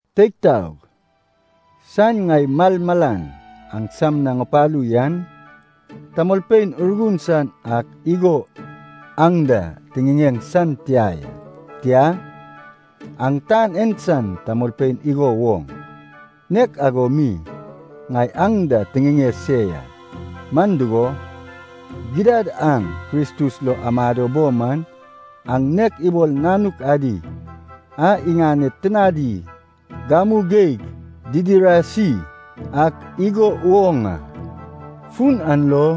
Teig taog, saen ŋai malmalan aŋsam na ŋupalu yan, tamolpein Urgun san ak igo aŋ da tiŋiŋeŋ san tia ya. Tia, aŋ tan en san tamolpein igo woŋ, nek ago mi ŋai aŋ da tiŋiŋeŋ se ya. Man dugo, gidad aŋ Kristus lo amado bo man, aŋ nek ibol nanuk adi a iŋaned tinadi gamu geig didiraisi ak igo woŋ a. Fun an lo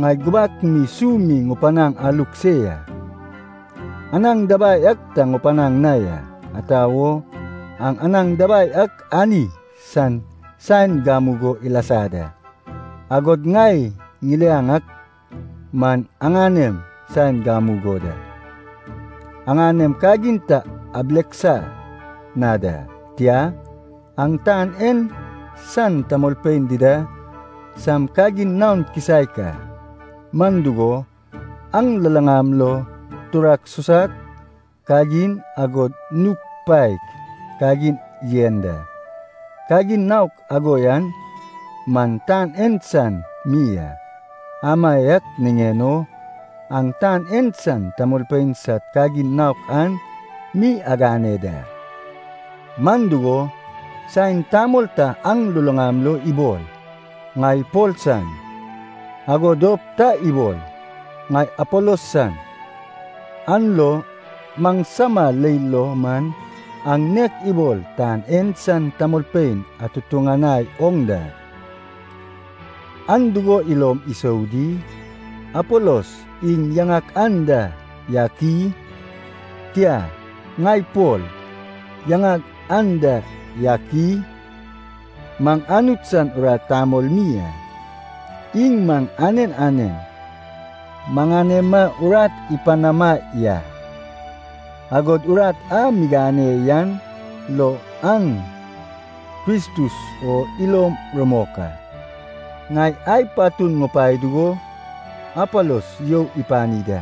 ŋai gubak mi su mi ŋupanaŋ aluk se ya, anaŋ dabai ak ta ŋupanaŋ na ya. Ata wo, aŋ anaŋ dabai ak ani san saen gamugo ilasa da. Agod ŋai ŋiliaŋ ak man aŋanem saen gamugo da. Aŋanem kagin ta abileksa na da, tia, aŋ tan en san tamolpein dida sam kagin naon kisaek a. Man dugo, aŋ luluŋam lo turak susak kagin, agod nug paek kagin yen da. Kagin naok ago yan man tan en san mi a. Amaiak niŋen o aŋ tan en san tamolpein sad kagin naok an mi agane da. Man dugo, saen tamol ta aŋ luluŋam lo ibol, “Ŋai Pol san,” ago dop ta ibol, “Ŋai Apolos san,” an lo maŋsama leil lo man aŋ nek ibol tan en san tamolpein atutuŋanai oŋ da. Aŋ dugo ilom isou di? Apolos iŋ yaŋak anda yak i? Tia, ŋai Pol yaŋag anda yak i? Maŋ Anut san urat tamol mi a. Iŋ maŋ anen anen maŋanema urat ipanama ya, agod urat a migane yan lo aŋ Kristus o ilom rumok a. Ŋai ai patun ŋupae dugo Apolos you ipani da,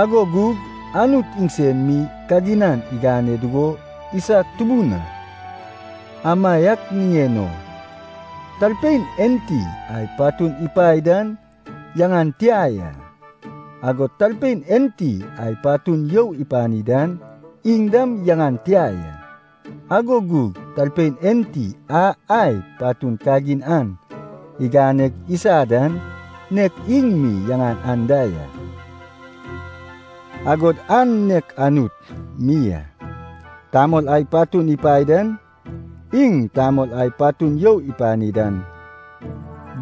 ago gug Anut iŋsen mi kaginan igane dugo isag tubun a. Amaiak niŋen o talpein enti ai patun ipae dan yaŋan tia ya, agod talpein enti ai patun you ipani dan, iŋ dam yaŋan tia ya, ago gug talpein enti a ai patun kagin an iganeg isa dan, nek iŋ mi yaŋan an da ya, agod an nek Anut mi a. Tamol ai patun ipae dan, iŋ tamol ai patun you ipani dan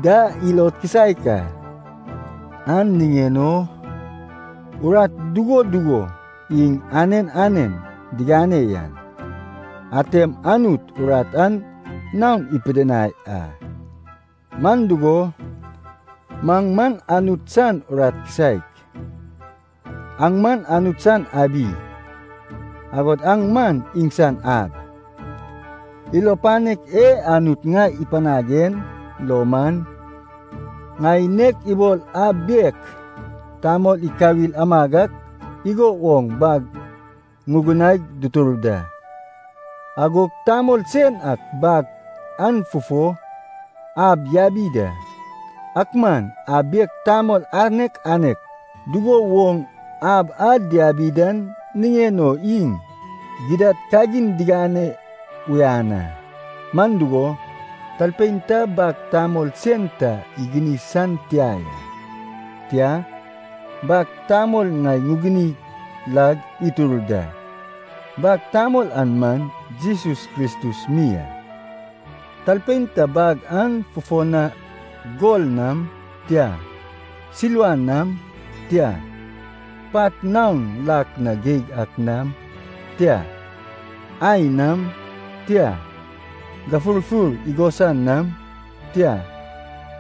da, ilod kisaek a. An niŋen o urat dugo dugo iŋ anen anen digane yan, atem Anut urat an naon ipidinai a. Man dugo, maŋ man Anut san urat kisaek. Aŋ man Anut san abi, agod aŋ man iŋsan ab. Ilo panek e Anut ŋai ipanag en lo man, ŋai nek ibol ab bek tamol ikawil amag ak igo woŋ bag ŋugunaig dutur da. Agog tamol sen ak bag an fufo ab yabi da. Ak man ab bek tamol anek anek dugo woŋ ab a diabi dan niŋen o iŋ gidad kagin digane uyan a. Man dugo, talpein ta bag tamol sen ta iguni san tia ya. Tia, bag tamol ŋai ŋuguni lag itur da. Bag tamol an man Jesus Kristus mi a. Talpein ta bag an fufo na gol nam, tia, silva nam, tia, pat naon lak na geig ak nam, tia, ai nam, tia, gafurfur igosan nam, tia,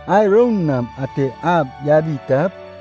ai roun nam ate ab yabi tap,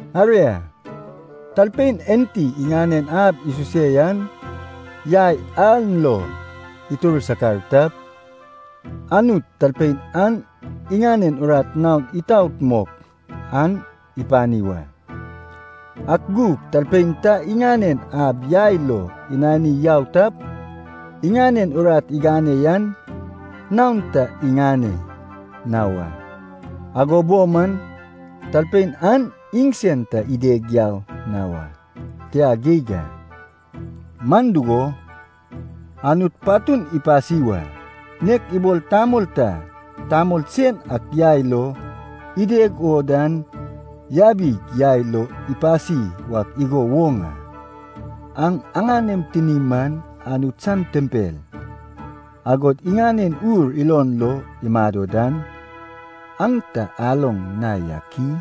Aria, talpein enti iŋanen ab isuse yan yai an lo itur sakar tap, Anut talpein an iŋanen urat naon itaot mok an ipani wa. Ak gug talpein ta iŋanen ab yai lo inani yau tap, iŋanen urat igane yan naon ta iŋane na wa. Ago bo man, talpein an iŋsen ta ideg na wa, tia geig a. Man dugo, Anut patun ipasi wa, nek ibol tamol ta tamol sen ak yai lo ideg o dan yabip yai lo ipasi wak igo woŋ a. Aŋ aŋanem tinim man Anut san tempel, agod iŋanen Ur ilom lo imado dan, aŋ ta aloŋ na yak i?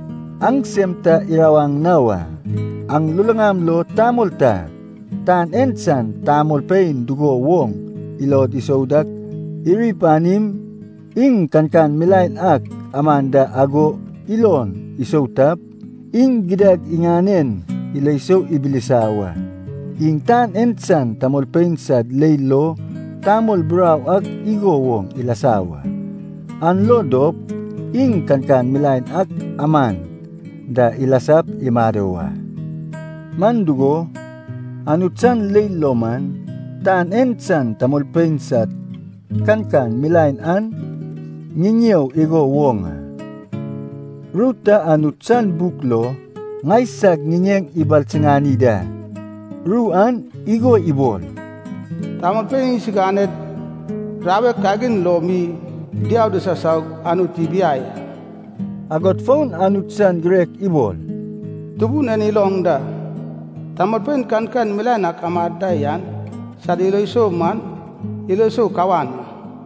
Aŋ sem ta irawaŋ na wa. Aŋ luluŋam lo tamol ta, tan en san tamolpein dugo woŋ ilod isou dak iri panim, iŋ kankan milaen ak aman da ago ilon isou tap, iŋ gidad iŋanen ilo sou ibilisa wa. Iŋ tan en san tamolpein sad leil lo tamol burau ak igo woŋ ilasa wa. An lo dop iŋ kankan milaen ak aman da ilasap imado wa. Man dugo, Anut san leil lo man, tan en san tamolpein sad kankan milaen an ŋiŋeo igo woŋ a. Ru ta Anut san buk lo ŋaisag ŋiŋeŋ ibalsiŋani da, ru an igo ibol, “Tamolpein iŋsiganed rawek kagin lo mi diau disasaug Anut ibiai a.” Agod fon Anut san girek ibol, “Tubun en iloŋ da, tamolpein kankan milaen ak amad da yan sad ilo sou man, ilo sou kawan a.”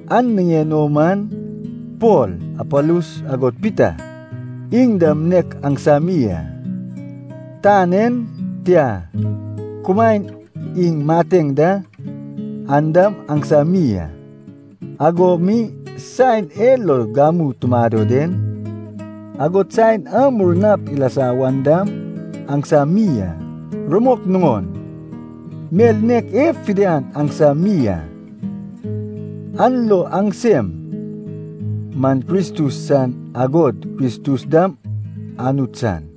An niŋen o man, Pol, Apolos agod Pita, iŋ dam nek aŋsami a. Tan en, tia, kumaen iŋ mateŋ da, an dam aŋsami a. Ago mi saen e lo gamu tumado den, agod saen a murnap ilasa wan dam aŋsami a. Rumok nuŋon, mel nek en fidian aŋsam mi a. An lo aŋsem man Kristus san, agod Kristus dam Anut san.